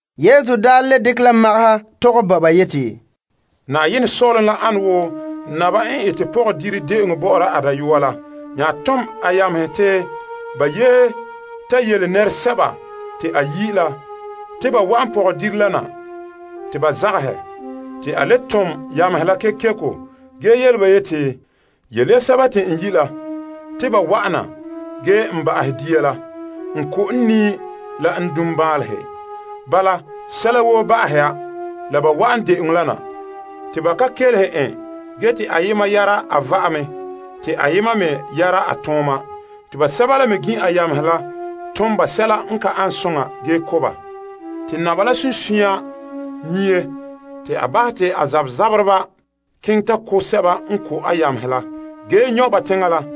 Yesu daa le dekɛ la magaha tɔgɛ bo ba yeti, Saazuo sɔ'ɔlom ane wo naba n ete pɔgɔdire de'eŋɔ bɔ'ɔra a dayɔa la. A nya tom a yamehe te ba yi' nɛreba te ba wa'an de'eŋɔ la na, te nɛreba la zagahɛ. A nya le tom yamehe kekeko ge yele ba yeti, Yele ya sɛba te n yi' la te ba wa'ana. N ko' n lɔlehe la n niikanra te sɛla woo ba'ahɛ ya te ba wa'an de'eŋɔ la na. Ge ba ka kelehe en ge te ayema yara a va'ame te ayema me yara a tooma. Basɛba la me gin' a yamehe la tom ba sɛla n ka ane soŋa ge ko' ba. Naba la sunsunya nyie. A bahɛ te a zabzabereba keŋɛ ta ko' sɛba n ko' a yamehe la ge nyɔ' ba teŋa la.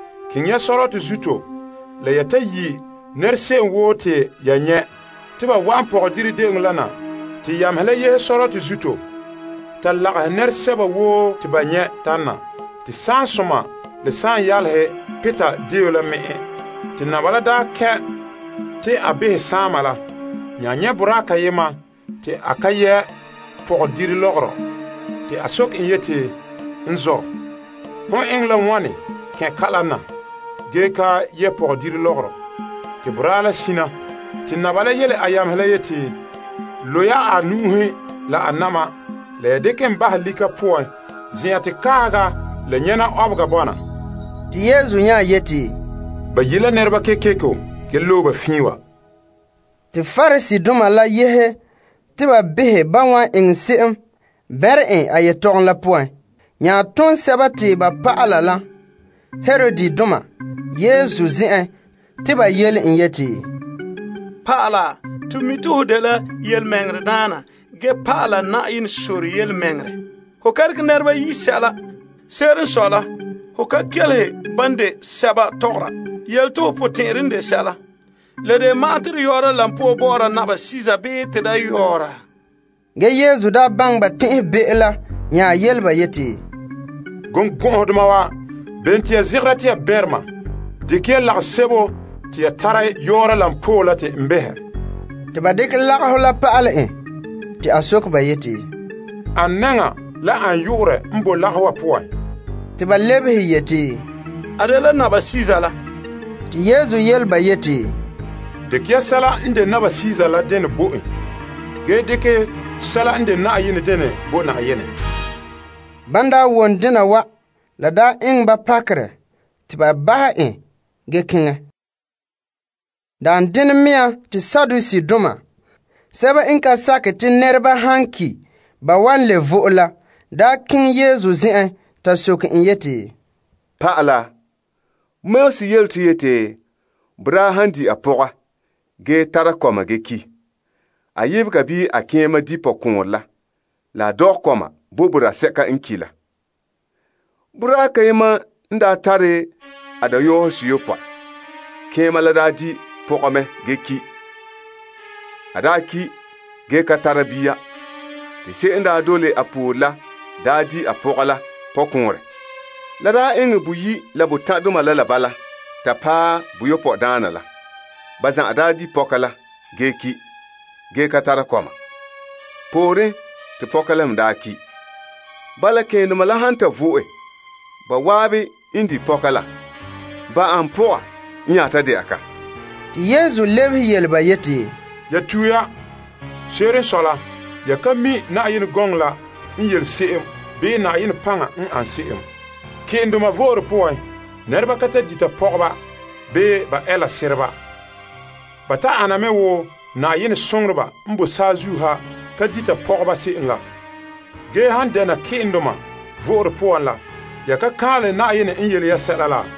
Keŋɛ ya sɔrɔtɔ zuto la ya ta yi' nɛra se'em woo te ya nyɛ' te ba wa'an pɔgɔdire de'eŋɔ la na. Te yamehe la yehe sɔrɔtɔ zuto ta lagahɛ nɛresɛba woo te ba nyɛ' tana te saansoma la saanyaalehe pirɛ deo la me'en. Ge naba la n ta kɛn' te a behɛ saama la, a nyɛ' boraa kayema te a ka yɛ' pɔgɔdire lɔgɔrɔ. A soke en yeti, N zɔ', hon eŋɛ la wane kɛn' kala na ge ka yɛ' pɔgɔdire lɔgɔrɔ? Te boraa la sina. Naba la nya yele a yamehe la yeti, Lo' ya a nu'uhe la a na'ma la ya dekɛ en bahɛ lika poan, zen'an te kaahega la nyɛna ɔbega bɔna. Te Yesu nya yeti, Ba yi' la nɛreba kekeko ge loe ba fiin wa. Te Pariseedoma la daa yehe te ba behɛ ban wan eŋɛ se'em bɛnrɛ en a yetɔgom la poan. Ba nya tom ba dɔlɔba la Herodidoma basɛba Yesu zen'en. Ba yele en yeti, Pa'ala, to mi' te hon de birikinte ge pa'ala Yenɛ sore yelemɛŋɛrɛ. Ho ka tare ninkɔ'ɔrɔ i la se'em bii ho kelehe nɛreba tɔgom. Yele to ho potɛn'ɛre n de sɛla. La de ma'an te to yɔɔra koba bɔ'ɔra Kaesar bii te da yɔɔra? Ge Yesu daa baŋɛ ba tɛn'ɛhebe'o la nya yele ba yeti, Birikɔgɔdoma wa, bene te ya zegera te ya bɛnrɛ ma? Dekɛ ya lagasebo te ya tara yɔɔra koba la te n behɛ. Te ba dekɛ lagahɔ la pa'ale en. A soke ba yeti, Ane nɛŋa la a yu'urɛ n boe lagahɔ wa poan? Ba lebehe yeti, A dela Kaesar la. Te a lebehe ba yeti, Dekɛ ya sɛla n de Kaesar la denɛ bo en ge dekɛ sɛla n de Yenɛ denɛ bo Yenɛ. Ban wom dena wa, la eŋɛ ba pakerɛ te ba bahɛ en ge keŋɛ. Daan denɛ mea te Saduseedoma, sɛba n ka sakɛ te nɛreba han ki' ba wan le vo'e la, daa keŋɛ Yesu zen'en ta soke en yeti, Pa'ala, Moses yele to yeti boraa han di' ge ka tara kɔma ge ki', a sɔɔn di' pɔkɔɔnrɛ la la a dɔgɛ kɔma bo boraa sɛka n ki' la. Boraa kayema n daa tare a dayɔseyopɔe. Keema la daa di' pɔga mɛ ge ki'. A daa ki' ge ka tara bia, te se'em n daa dole a poore la daa di' a pɔga la pɔkɔɔnrɛ. La daa eŋɛ boyi' la botan' doma la bala ta paɛ boyopɔe daana la, ba zan'an daa di' pɔka la ge ki', ge ka tara kɔma. Pooren, te pɔka la me daa ki'. Bala, ke'endoma la han ta vo'e, ba zan'an n di' pɔka la, ba ane pɔga n nya ta dɛna ka? Yesu lebehe yele ba yeti, Ya tue ya. Se'ere n sɔe la, ya ka mi' Yenɛ gɔŋɔ la n yele se'em bii Yenɛ paŋa n an se'em. Ke'endoma vo'ore poan, nɛreba ka ta dita pɔgɔba bii ba ɛɛla sereba. Ba ta ana me wo Yenɛ soŋoreba n bo saazuo ha ka dita pɔgɔba se'em la. Ge han dɛna ke'endoma vo'ore poan la, ya ka kaanlɛ Yenɛ n yele ya sɛla la?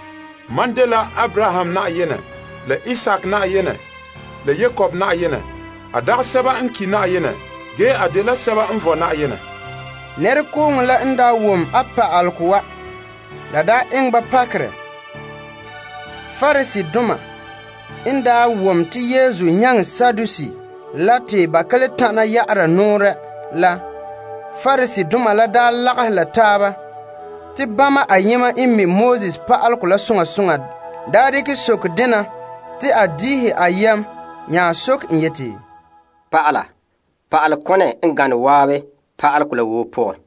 Mam n de Abraham la Isaak la Yakob Yenɛ la. A dagɛ sɛba n ki' Yenɛ ge a dela sɛba n vɔe Yenɛ. Nɛrekooŋɔ la n wom a pa'alegɔ wa, la eŋɛ ba pakerɛ. Pariseedoma n daa wom te Yesu nyaŋɛ Saduseedoma la te ba ka le tana ya'ara nɔɔrɛ la, Pariseedoma la lagahɛ la taaba. Te bama ayema n mi' pa'alegɔ la soŋa soŋa dekɛ sokere dena te a magahɔ en behɛ yeti, Pa'ala, pa'alekone a gane zan'an Pa'alegɔ la woo poan?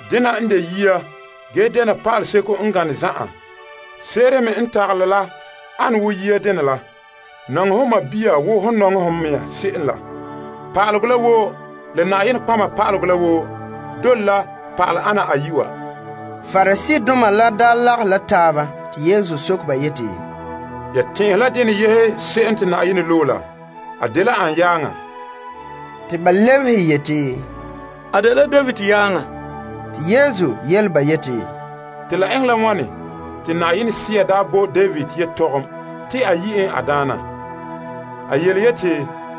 Dena n de yia ge dɛna pa'aleseko n gane zan'an. Se'ere me n tagalɛ la an wo yia dene la, Ton nɔŋɛ ho tadaana wo hom n nɔŋɛ ho mɛŋa se'em la. Pa'alegɔ la woo la Nɔtɔgɔheba la woo dole la pa'ale ana ayi' wa. Pariseedoma n daa lagahe la taaba, Yesu soke ba yeti, Ya tɛn'ɛhe la dene yehe se'em te Yenɛ loe la? A dela an yaaŋa? Ba lebehe yeti, A dela David yaaŋa. A yele ba yeti, Te la eŋɛ la wane te Sea daa bo David yetɔgom te a yi' en a Daana? A yeti,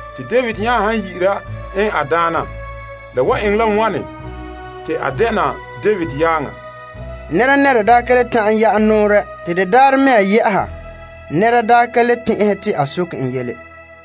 Te David nya han yi'ira en a Daana, la wan eŋɛ la wane te a dɛna David yaaŋa? Nɛnɛra daa ka le ta'an ya'ɛ nɔɔrɛ. Te de daarɛ mea yɛ'ɛha nɛra daa ka le tɛn'ɛhe te a soke en yele.